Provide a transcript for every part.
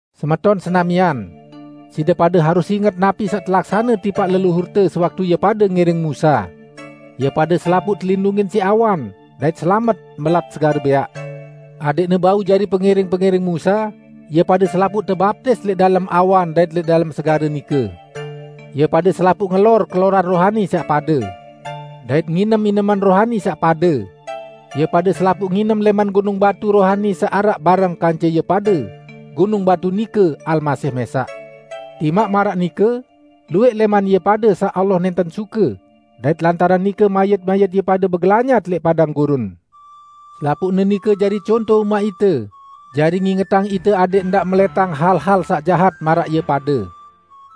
Semeton senamian! Side pade harus inget napi saq telaksane tipaq leluhurte sewaktu ie pade ngiring Musa. Ie pade selapuq telindungin siq awan, dait selamet mbelat Segare Bẽaq. Adẽqne bau jari pengiring-pengiring Musa, ie pade selapuq tebaptis lẽq dalem awan dait lẽq dalem segare nike. Ie pade selapuq ngelor keloran rohani saq pade, dait nginem ineman rohani saq pade. Ie pade selapuq nginem lẽman gunung batu rohani saq araq bareng kance ie pade; gunung batu nike Almasih mẽsaq. Timaq maraq nike, luwẽq lẽman ie pade saq Allah nẽnten suke, dait lantaran nike mayit-mayit ie pade begelanyat lẽq padang gurun. Selapuqne nike jari conto umaq ite, jari ngingetang ite adẽq ndaq melẽtang hal-hal saq jahat maraq ie pade.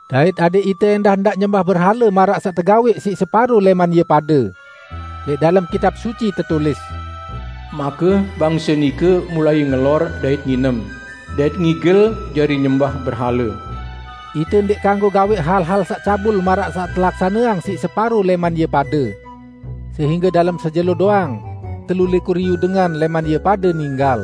Dait adẽq ite ẽndah ndaq nyembah berhale maraq saq tegawẽq siq separo lẽman ie pade. Lẽq dalem Kitab Suci tetulis, "Make bangse nike mulai ngelor dait nginem, dait ngigel jari nyembah berhale." Ite ndẽq kanggo gawẽq hal-hal saq cabul maraq saq telaksaneang siq separo lẽman ie pade. Sehingge dalem sejelo doang, telu likur iyu dengan lẽman ie pade ninggal.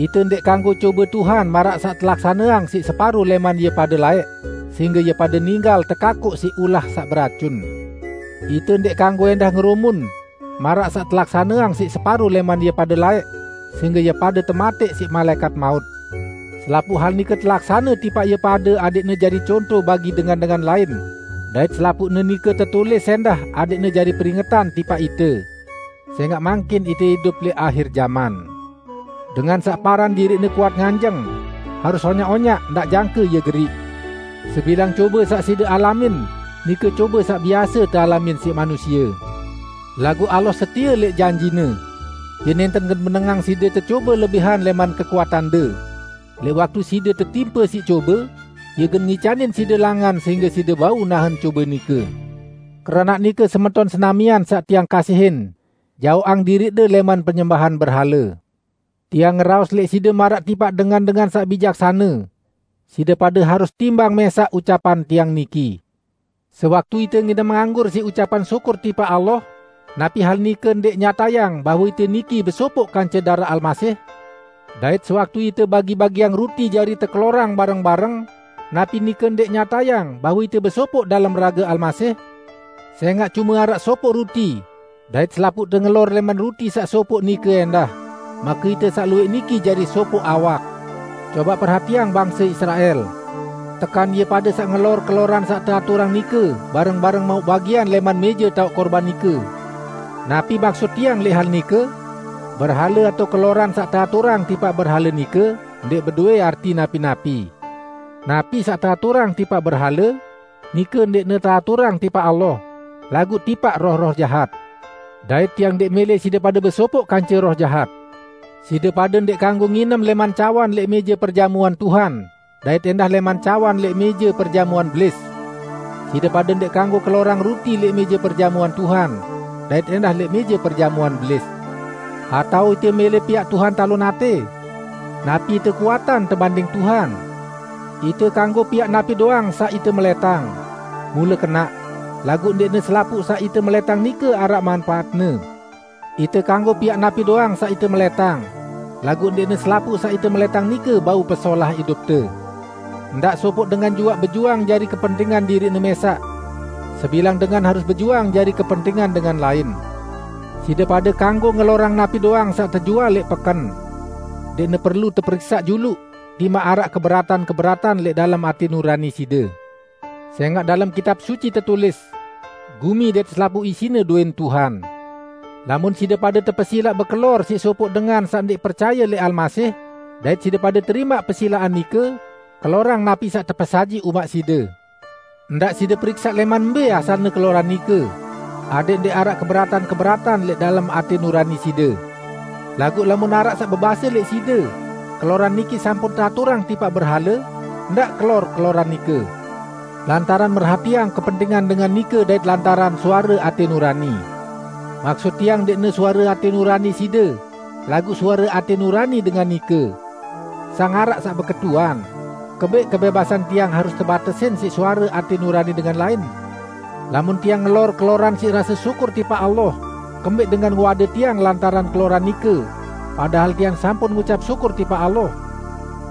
Ite ndẽq kanggo cobe Tuhan maraq saq telaksaneang siq separo lẽman ie pade laẽq, sehingge ie pade ninggal tekakoq siq ulah saq beracun. Ite ndẽq kanggo ẽndah ngerumun; maraq saq telaksaneang siq separo lẽman ie pade laẽq, sehingge ie pade tematẽq siq malaẽkat maut. Selapuq hal nike telaksane tipaq ie pade adẽqne jari conto bagi dengan-dengan lain. Dait selapuqne nike tetulis ẽndah adẽqne jari peringetan tipaq ite. Sẽngaq mangkin ite idup lẽq ahir jaman. Dengan saq paran diriqne kuat nganjeng, harus onyaq-onyaq; ndaq jangke ie geriq. Sebilang cobe saq side alamin, nike cobe saq biase tealamin siq manusie. Laguq Allah setie lẽq janji-Ne. Ie nẽnten gen menengang side tecobe lebihan lẽman kekuatande. Lẽq waktu side tetimpe siq cobe, Ie gen ngicanin side langan sehingge side bau nahen cobe nike. Keranaq nike, semeton senamian saq tiang kasihin, jaoqang diriqde lẽman penyembahan berhale. Tiang ngeraos lẽq side maraq tipaq dengan-dengan saq bijaksane. Side pade harus timbang mẽsaq ucapan tiang niki. Sewaktu ite nginem anggur siq ucapan syukur tipaq Allah, napi hal nike ndẽq nyatayang bahwe ite niki besopoq kance daraq Almasih? Dait sewaktu ite bagi-bagiang ruti jari tekelorang bareng-bareng, napi nike ndẽq nyatayang bahwe ite besopoq dalem rage Almasih? Sẽngaq cume araq sopoq ruti, dait selapuqte ngelor lẽman ruti saq sopoq nike ẽndah, make ite saq luwẽq niki jari sopoq awak. Cobaq perhatiang bangse Israel. Tekan ie pade saq ngelor keloran saq teaturang nike bareng-bareng mauq bagian lẽman mẽje taoq kurban nike? Napi maksut tiang lẽq hal nike? Berhale atao keloran saq teaturang tipaq berhale nike ndẽq bedowẽ arti napi-napi. Napi saq teaturang tipaq berhale, nike ndẽqne teaturang tipaq Allah, laguq tipaq roh-roh jahat. Dait tiang ndẽq mẽlẽ side pade besopoq kance roh jahat. Side pade ndẽq kanggo nginem lẽman cawan lẽq mẽje perjamuan Tuhan dait ẽndah lẽman cawan lẽq mẽje perjamuan Belis. Side pade ndẽq kanggo kelorang ruti lẽq mẽje perjamuan Tuhan, dait ẽndah lẽq mẽje perjamuan Belis. Atao ite mẽlẽ piaq Tuhan talon atẽ? Napi ite kuatan tebanding Tuhan? "Ite kanggo piaq napi doang saq ite melẽtang." Mule kenaq! Laguq ndẽqne selapuq saq ite melẽtang nike araq manpaatne. "Ite kanggo piaq napi doang saq ite melẽtang" -- laguq ndẽqne selapuq saq ite melẽtang nike bau pesolah idupte. Ndaq sopoq dengan juaq bejuang jari kepentingan diriqne mẽsaq. Sebilang dengan harus bejuang jari kepentingan dengan lain. Side pade kanggo ngelorang napi doang saq tejual lẽq peken. Ndẽqne perlu teperiksaq juluq, timaq araq keberatan-keberatan lẽq dalem atẽ nurani side. Sẽngaq dalem Kitab Suci tetulis, "Gumi dait selapuq isine dowẽn Tuhan." Lamun side pade tepesilaq bekelor siq sopoq dengan saq ndẽq percaye lẽq Almasih, dait side pade terimaq pesilaqan nike, kelorang napi saq tepesajiq umaq side. Ndaq side periksaq lẽman mbẽ asalne keloran nike, adẽq ndẽq araq keberatan-keberatan lẽq dalem atẽ nurani side. Laguq lamun araq saq bebase lẽq side, "Keloran niki sampun teaturang tipaq berhale," ndaq kelor keloran nike, lantaran merhatiang kepentingan dengan nike dait lantaran suare atẽ nurani. Maksut tiang ndẽqne suare atẽ nurani side, laguq suare atẽ nurani dengan nike. Sang araq saq beketuan, "Kembẽq kebẽbasan tiang harus tebatesin siq suare atẽ nurani dengan lain? Lamun tiang ngelor keloran siq rase syukur tipaq Allah, kembẽq dengan ngewade tiang lantaran keloran nike, padahal tiang sampun ngucap syukur tipaq Allah?"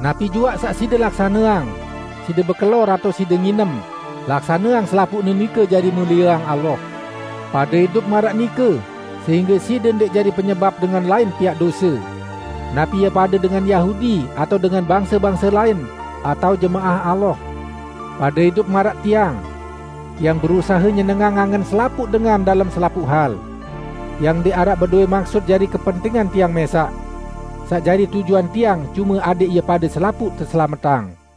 Napi juaq saq side laksaneang -- side bekelor atao side nginem -- laksaneang selapuqne nike jari mulieang Allah. Pade idup maraq nike sehingge side ndẽq jari penyebap dengan lain piaq dose; napi ie pade dengan Yahudi atao dengan bangse-bangse lain, atao jemaah Allah. Pade idup maraq tiang. Tiang berusahe nyenengang angen selapuq dengan dalem selapuq hal. Tiang ndẽq araq bedowẽ maksut jari kepentingan tiang mẽsaq. Saq jari tujuan tiang cume adẽq ie pade selapuq teselametang.